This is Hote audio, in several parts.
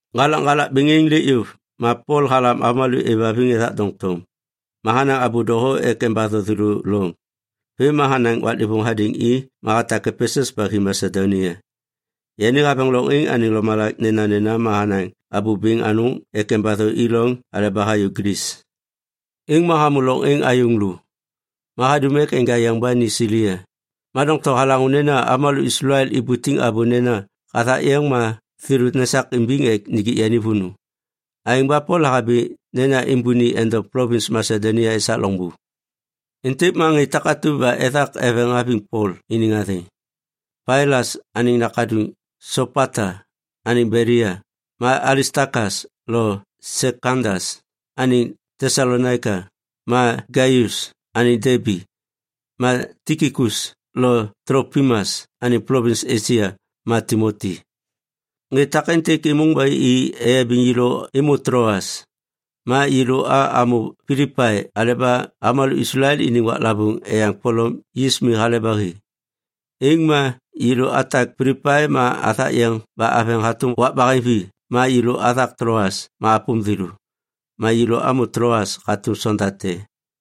Ŋgalakŋgalak bêŋ êŋ lêk yôv, ma Pol halam avômalô êvhaviŋ ethak doŋtom. Ma hanaŋ abô doho ek embatho thêlô loŋ. Vêm ma hanaŋ waklêvôŋ hadêŋ i ma hatak Epesus ba hi Masedonia. Yani haveŋ loŋ êŋ anêŋ lomalak nenanena ma hanaŋ abô bêŋ anôŋ ek embatho i loŋ aleba hayô Glis. Êŋ ma hamô loŋ êŋ ayôŋ lô. Ma hadum ek enja yeŋ ba ni Silia, ma doŋtom halaŋô nena avômalô Islael ibutiŋ abô nena hathak yeŋ ma thêlô nesak imbiŋ ek nijik yani vônô. Aêŋ ba Pol lahabi nena êmbôni endom plovins Masedonia esak loŋbô. Êntêk ma ŋê takatu ba ethak eveŋ haviŋ Pol iniŋ athêŋ: Sopata anêŋ Belia, yani ma Pailas anêŋ nakaduŋ, ma Alistakas lo Sekandas anêŋ Tesalonaika, ma Gaius anêŋ Debi, ma Tikikus lo Tlopimas anêŋ plovins Esia, ma Timoti. Ŋê takêntêk êmôŋ ba i eyabiŋ yêlô êmô Tloas. Ma yêlô a amô Pilipai aleba avômalô Islael iniŋ waklavôŋ Eyaŋ Polom Yis Mi hale ba hi. Êŋ ma yêlô atak Pilipai ma athak yeŋ ba aveŋ hatôm wak baheŋvi ma yêlô athak Tloas ma apôm thêlô. Ma yêlô amô Tloas hatôm sonda te.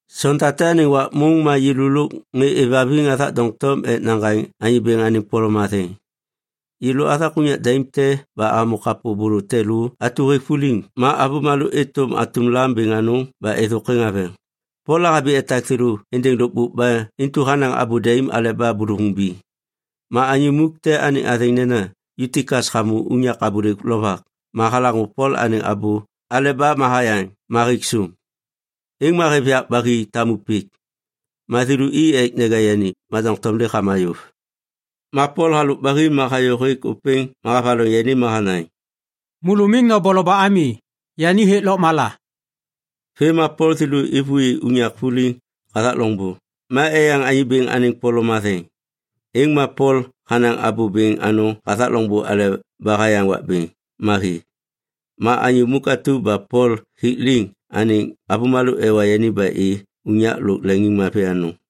Sonda te anêŋ wak môŋ ma yêlô lôk ŋê êvhaviŋ athak doŋtom ek naŋgaŋ Anyô Bêŋ anêŋ polom matheŋ. Yêlô athak unyak daim te ba amô kapô bôlô te lô atu hêk vuliŋ ma avômalô êtôm atum lam bêŋ anôŋ ba êthôkwêŋ haveŋ. Pol lahabi etak thêlô êndêŋ lôkbôk ba intu hanaŋ abô daim aleba bôlôvôŋ biŋ. Ma anyô muk te anêŋ athêŋ nena Yutikas hamô unyak abôlêk lovak ma halaŋô Pol anêŋ abô aleba ma hayaŋ ma hêk sôm. Êŋ ma hêv yak ba hi tamu pik. Ma thêlô i ek neja yani, ma doŋtom lêk hama yôv. Ma Pol halôk ba hi ma hayô hêk ôpêŋ ma havaloŋ yani ma hanaŋ, “Môlô miŋ noboloba ami. Yani hêk lôkmala.” Vêm ma Pol thêlô êvôi unyak vuliŋ hathak loŋbô ma eyaŋ Anyô Bêŋ anêŋ polom matheŋ. Êŋ ma Pol hanaŋ abô bêŋ anôŋ hathak loŋbô aleba hayaŋ wak bêŋ ma hi. Ma anyô muk atu ba Pol hik liŋ anêŋ avômalô ewa yani ba i unyak lôk leŋiŋmavi anôŋ.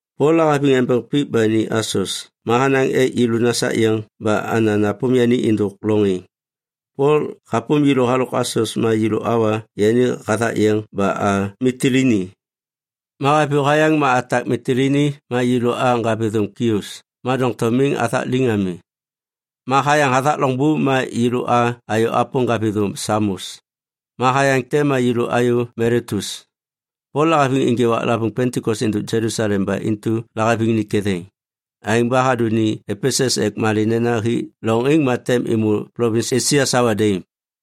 Pol lahaviŋ embeŋ pik ba ni Asos ma hanaŋ ek yêlô nasak yeŋ ba ana napôm yani êndôk loŋ êŋ. Pol hapôm yêlô halôk Asos ma yêlô awa yani hathak yeŋ ba a Mitilini. Ma haviyô hayaŋ ma atak Mitilini ma yêlô a ŋgavithôm Kios ma doŋtom miŋ athak liŋ ami. Ma hayaŋ hathak loŋbô ma yêlô a ayô apôm ŋgavithôm Samos. Ma hayaŋ te ma yêlô ayô Miletus. Pol lahaviŋ ênjê waklavôŋ Pentikos êndôk Jelusalem ba intu lahaviŋ ni ketheŋ. Aêŋ ba hadô ni Epesus ek malê nena hi loŋ êŋ ma tem êmô plovins Esia sawa daim.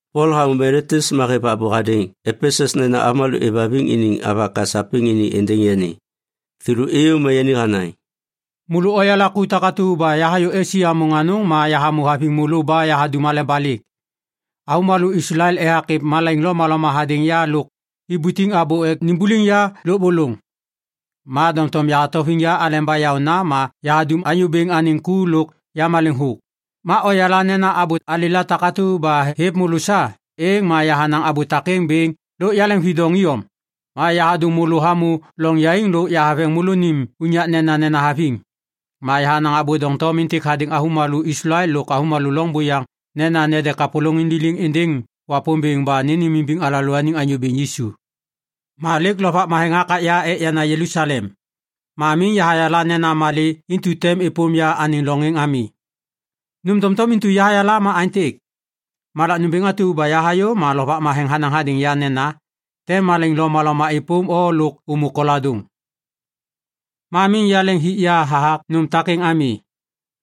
Pol hamô Miletus ma hêv abô hadêŋ Epesus nena avômalô êvhaviŋ iniŋ avaka sapêŋ ini êndêŋ yani. Thêlô êyô ma yani hanaŋ, “Môlô oyala ku takatu ba yahayô Esia môŋ anôŋ ma yahamô haviŋ môlô ba yahadum aleba lêk. Avômalô Islael ethak êv malaiŋ lomaloma hadêŋ ya lôk ibutiŋ abô ek nimbuliŋ ya lôbôlôŋ. Ma doŋtom yahatauviŋ ya aleba yaôna ma yahadum Anyô Bêŋ anêŋ ku lôk yamaleŋ thôk. Ma oyala nena abô alêla takatu ba hêv môlô sa, êŋ ma yahanaŋ abô takêŋ bêŋ lôk yaleŋvidoŋ iyom. Ma yahadôŋ môlô hamô loŋ yaiŋ lôk haveŋ môlônim unyak nenanena haviŋ. Ma yahanaŋ abô doŋtom êntêk hadêŋ avômalô Islael lôk avômalô loŋ buyaŋ nena nede kapôlôŋiŋ liliŋ êndêŋ Wapômbêŋ ba nênêmimbiŋ alalôaniŋ Anyô Bêŋ Yisu. “Ma lêk Lovak Matheŋ hakak ya ek yana Jelusalem. Ma miŋ yahayala nena malê intu tem êpôm ya anêŋ loŋ êŋ ami. Nôm doŋtom intu yahayala ma aêntêk. Malak nômbêŋ atu ba yahayô ma Lovak Matheŋ hanaŋ hadêŋ ya nena, “Tem malaiŋ lomaloma êpôm o lôk ômô koladôŋ.” Ma miŋ yaleŋ hik ya hathak nôm takêŋ ami.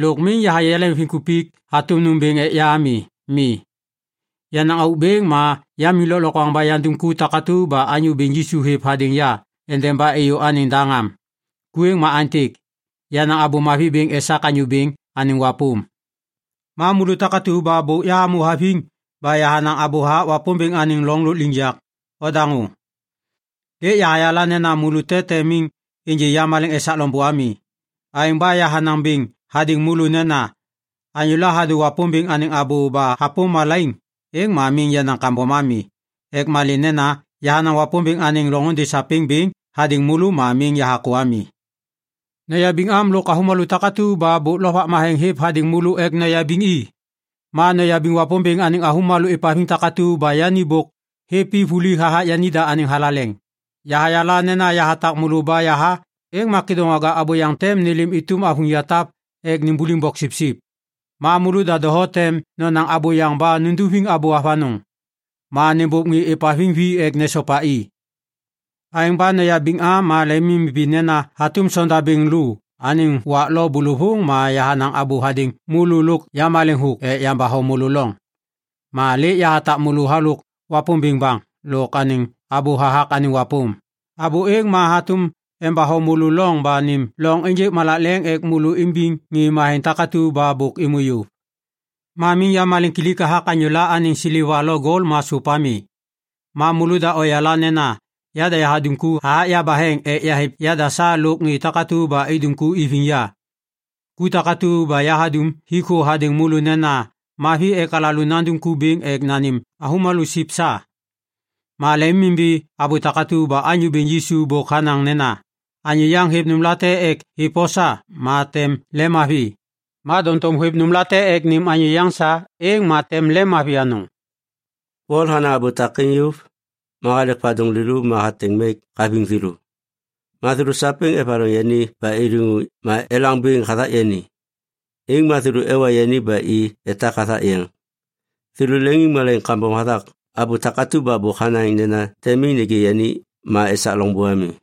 Lôk miŋ yahayê yaleŋviŋkupik hatôm nômbêŋ ek ya ami. Mi, yenaŋ auk bêŋ ma yamiŋ lôklokwaŋ ba yandum ku takatu ba Anyô Bêŋ Yisu hêv hadêŋ ya endeba êyô anêŋ daŋ am. Ku êŋ ma aêntêk: yanaŋ Abô Mavi bêŋ esak Anyô Bêŋ anêŋ wapôm. “Ma môlô takatu ba bôk yahamô haviŋ ba yahanaŋ abô hathak Wapômbêŋ anêŋ loŋ lôkliŋyak, ondaŋô. Lêk yahayala nena môlô te tem miŋ ênjê yamaleŋ esak loŋbô ami. Aêŋ ba yahanaŋ bêŋ hadêŋ môlô nena anyôla hadô Wapômbêŋ anêŋ abô ba hapôm malaiŋ, êŋ ma miŋ yenaŋ kambom ami. Ek malê nena yahanaŋ Wapômbêŋ anêŋ loŋôndê sapêŋ bêŋ hadêŋ môlô ma miŋ yahakô ami. Noyabiŋ am lôk avômalô takatu ba bôk Lovak Matheŋ hêv hadêŋ môlô ek noyabiŋ i. Ma noyabiŋ Wapômbêŋ anêŋ avômalô êvhaviŋ takatu ba yani bôk hêv i vuli hathak yanida anêŋ thalaleŋ. Yahayala nena yahatak môlô ba yaha, êŋ ma kêdôŋwaga abôyaŋ tem nêlêm êtôm avuŋ yatap ek nimbuliŋ boksipsip. Ma môlôda doho tem nonaŋ abôyaŋ ba nunduviŋ abô avanôŋ ek nôbôv ŋê êvhaviŋ vi ek nesopa i. Aêŋ ba noyabiŋ am ma lemimimbi nena hatôm sondabêŋ lô anêŋ wak lo bôlôvôŋ ma yahanaŋ abô hadêŋ môlô lôk yamaleŋ thôk ek yambatho môlô lôŋ. “Ma lêk yahatak môlô halôk Wapômbêŋ baŋ lôk anêŋ abô hathak anêŋ wapôm. Abô êŋ ma hatôm embatho môlô loŋ ba nêm loŋ ênjêk malak leŋ ek môlô imbiŋ ŋê matheŋ takatu ba bôk êmô yôv. Ma miŋ yamaleŋkilik hathak anyôla anêŋ seleva lo gol ma sôp ami. Ma môlôda oyala nena yada yahadum ku hathak yabaheŋ ek yahêv yada sa lôk ŋê takatu ba idum ku iviŋ ya. Ku takatu ba yahadum hik thô hadêŋ môlô nena mavi ek alalô nandum ku bêŋ ek nanêm avômalô siv sa. Ma lemimimbi abô takatu ba Anyô Bêŋ Yisu bôk hanaŋ nena, ‘Anyô yaŋ hêv nômlate ek hêv o sa, ma tem lemmavi. Ma doŋtom hôêv nômlate ek nêm anyô yaŋ sa, êŋ ma tem lemmavi anôŋ.’” Pol hanaŋ abô takêŋ yôv, ma halek vadôŋ lêlô ma hateŋ mek haviŋ thêlô. Ma thêlô sapêŋ evaloŋ yani ba iliŋu ma elaŋ bêŋ hathak yani. Êŋ ma thêlô ewa yani ba i etak hathak yeŋ. Thêlô leŋiŋmalaiŋ kambom hathak abô takatu ba bôk hanaŋ nena tem miŋ nêgê yani ma esak loŋbô ami.